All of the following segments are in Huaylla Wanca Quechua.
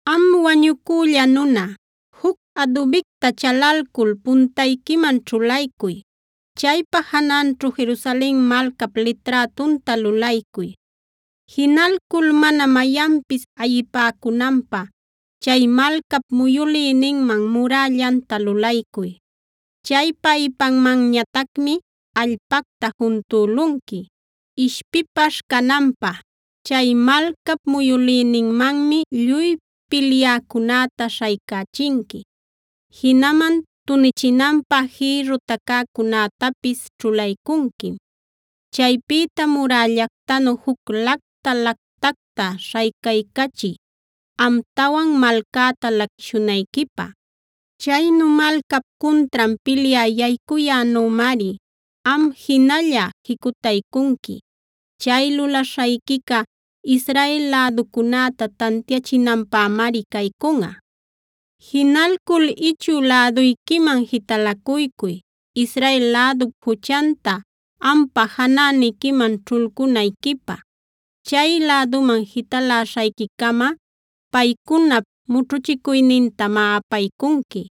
“Am wañucülla nuna, juc adubicta chalalcul puntayquiman ćhulaycuy. Chaypa jananćhu Jerusalen malcap liträtunta lulaycuy. Jinalcul mana mayanpis ayipäcunanpä chay malcap muyülïninman murällanta lulaycuy. Chaypa ipanmanñatacmi allpacta juntülunqui ishpipaśh cananpä. Chay malcap muyülïninmanmi lluy pilyäcunäta śhaycächinqui; jinaman tunichinanpä jïrru tacäcunätapis ćhulaycunquim. Chaypïta murällactanu juc lacta lätacta śhaycaycachiy, amtawan malcäta laquishunayquipä. Chaynu malcap cuntran pilyä yaycuyänümari am jinalla jicutaycunqui. Chay lulaśhayquica Israel läducunäta tantiachinanpämari caycunꞌa. “Jinalcul ichü läduyquiman jitalacuycuy Israel lädup juchanta ampa janäniquiman ćhulcunayquipä. Chay läduman jitaläśhayquicama paycunap mućhuchicuynintamá apaycunqui.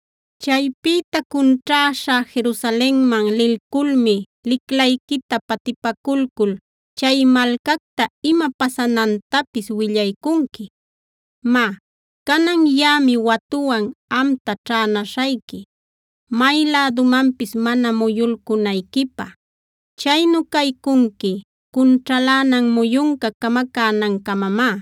Chaypïta cunćhäśha Jerusalenman lilculmi liclayquita patipaculcula chay malcacta ima pasanantapis willaycunqui. Má, canan yaꞌami watuwan amta ćhänäśhayqui may lädumanpis mana muyulcunayquipä. Chaynu caycunqui cunćhalänan muyunca camacänancamamá.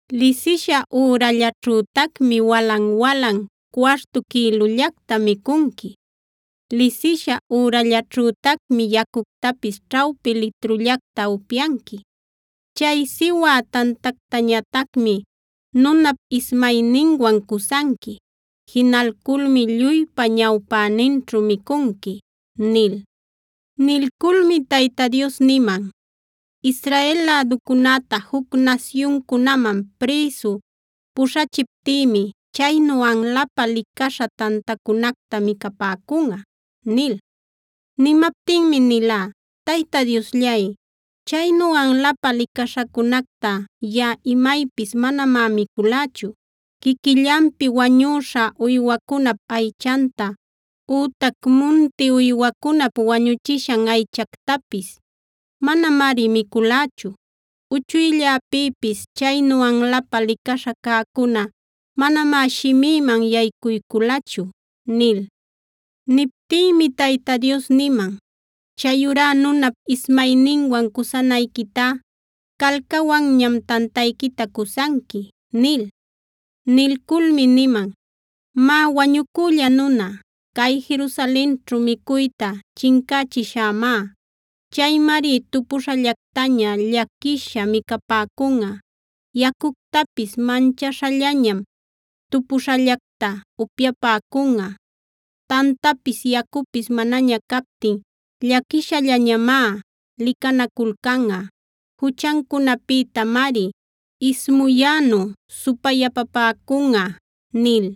Lisisha ürallaćhütacmi walan-walan cuartu quïlullacta micunqui. Lisisha ürallaćhütacmi yacuctapis ćhawpi litrullacta upyanqui. Chay siwä tantactañatacmi nunap ismayninwan cusanqui. Jinalculmi lluypa ñawpäninćhu micunqui” nil. Nilculmi Tayta Dios niman: “Israel läducunäta juc nasyuncunaman prïsu puśhachiptïmi chaynu anlapä licaśha tantacunacta micapäcunꞌa” nil. Nimaptinmi nilá: Tayta Diosllay, chaynu anlapä licaśhacunacta yaꞌa imaypis manamá miculächu. Quiquillanpi wañüśha uywacunap aychanta ütac munti uywacunap wañuchishan aychactapis manamari miculächu. Uchuylläpïpis chaynu anlapä licaśha cäcuna manamá shimïman yaycuyculachu” nil. Niptïmi Tayta Dios niman: “Chayurá nunap ismayninwan cusanayquitá calcawanñam tantayquita cusanqui” nil. Nilculmi niman: “Má wañucülla nuna, cay Jerusalenćhu micuyta chincächishämá. Chaymari tupuśhallactaña llaquisha micapäcunꞌa. Yacuctapis manchaśhallañam tupuśhallacta upyapäcunꞌa. Tantapis yacupis manaña captin llaquishallañamá licanaculcanꞌa. Juchancunapïtamari ismuyänu supayapapäcunꞌa” nil.